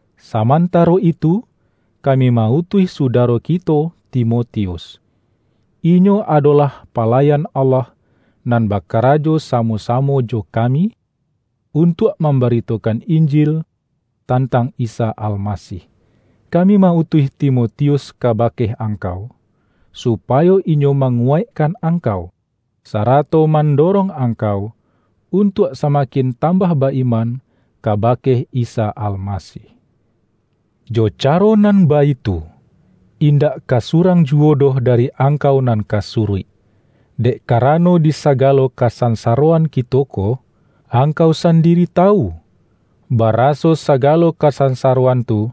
samantaro itu, kami ma-utuih su-daro kito Timotius. Inyo adolah pa-layan Allah nan bakarajo samo-samo jo kami, untuak mambaritokan Injil tantang Isa Almasih. Kami ma-utuih Timotius kabake angkau, supayo inyo manguwaikkan angkau, sarato man-dorong angkau, untuak samakin tam-bah ba-iman kabake Isa Almasih. Jo caro nan baitu, indak ka surang juwo doh dari angkau nan ka suruik, dek karano di sagalo kasansaroan kito ko. Angkau sandiri tawu, baraso sagalo kasansaroan tu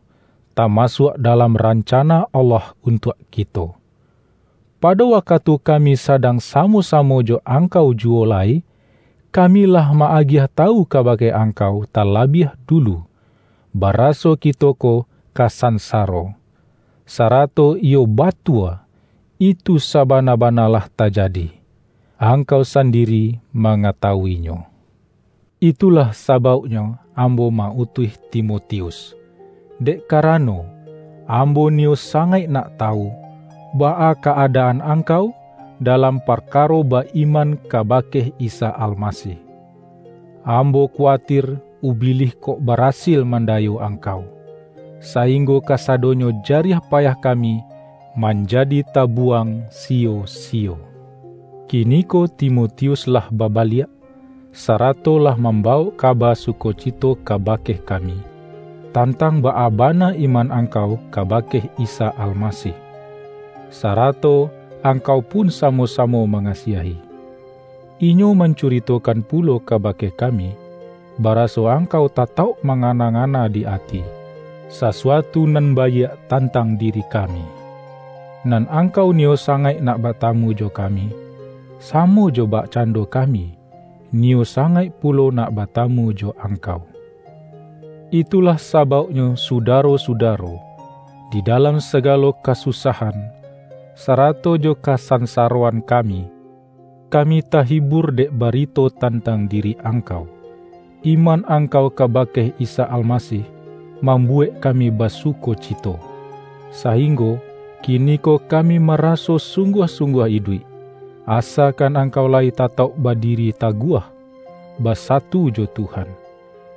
tamasuak dalam ran-cana Allah untuak kito. Pado waka-tu kami sadang samo-samo jo angkau juwo lai, kami lah ma-agiah tawu kabake angkau talabiah dulu, bara-so kito ko ka sansaro. Sarato iyo ba-tua, itu sabana-bana lah tajadi; ang-kau sandiri mangatawu-inyo. Itulah sabauknyo ambo ma-utuih Timotius, dek karano, ambo niyo sangaik nak tawu, baa ka-adaan angkau dalam parkaro ba-iman kabake Isa Almasih. Ambo kuwatir Ubilih kok barasil mandayo angkau, sainggo kasado-nyo jariah payah kami manjadi tabu-wang siyo-siyo. Kiniko Timotius lah babaliak, sa-rato lah mambawok kaba sukocito kabake kami, tantang baa bana iman angkau kabake Isa Almasih, sarato angkau pun samo-samo mangasiahi. Inyo mancuritokan pulo kabake kami, baraso angkau tatauk mangana-nga-na di ati, sasuatu nan baiak tantang diri kami. Nan angkau niyo sangaik nak batamu jo kami, samo jo bakcan-do kami, niyo sangaik pulo nak ba-tamu jo angkau. Itulah sabauknyo sudaro-sudaro, di dalam sagalo ka-susahan, sarato jo kasansaroan kami, kami tahibur dek barito tantang di-ri angkau. Iman angkau kabake Isa Almasih mambuwek kami basuko-cito, sainggo kiniko kami maraso sungguah-sungguah iduik, asakan angkau layi tatauk badiri taguah, ba-satu jo Tuhan.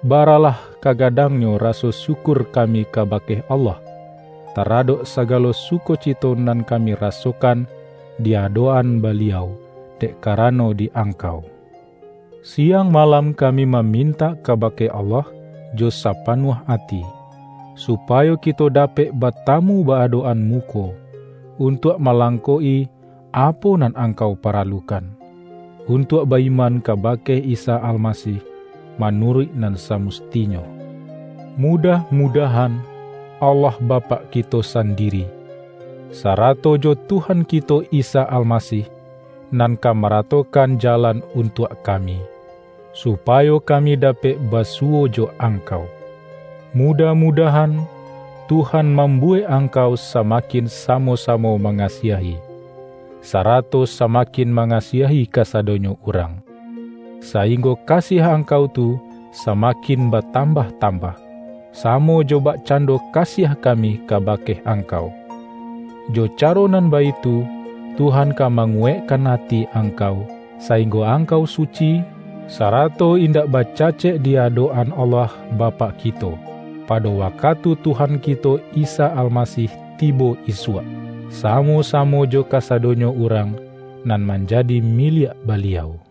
Baralah kagadangnyo raso syukur kami kabake Allah, ta-radok sagalo sukocito nan kami ra-sokan di adok-an Baliau, dek karano di angkau. Siang malam kami ma-mintak kabake Allah jo sapanuah ati, supayo kito dapek batamu ba-adok-an muko, untuak malangkok-i apo nan angkau paralukan, untuak ba-iman kabake Isa Almasih manuruik nan samustinyo. Mudah-mudahan Allah Bapak ki-to sandiri, sarato jo Tuhan kito Isa Almasih, nan ka maratokan jalan untuak kami, supayo kami dapek basuwo jo angkau! Mudah-mudahan, Tuhan mambuwek angkau samakin samo-samo mangasiahi, sarato sama-kin mangasiahi kasadonyo urang, sa-inggo kasiah angkau tu samakin ba-tambah-tambah, samo jo bakcando kasiah kami kabake angkau. Jo ca-ro nan baitu, Tuhan ka manguwaik-kan ati angkau, sainggo angkau su-ci, sarato indak bacacek di adok-an Allah Bapak kito, pado wakatu Tuhan kito Isa Almasih tibo isuak, samo-sa-mo jo kasadonyo urang nan manjadi miliak Baliau.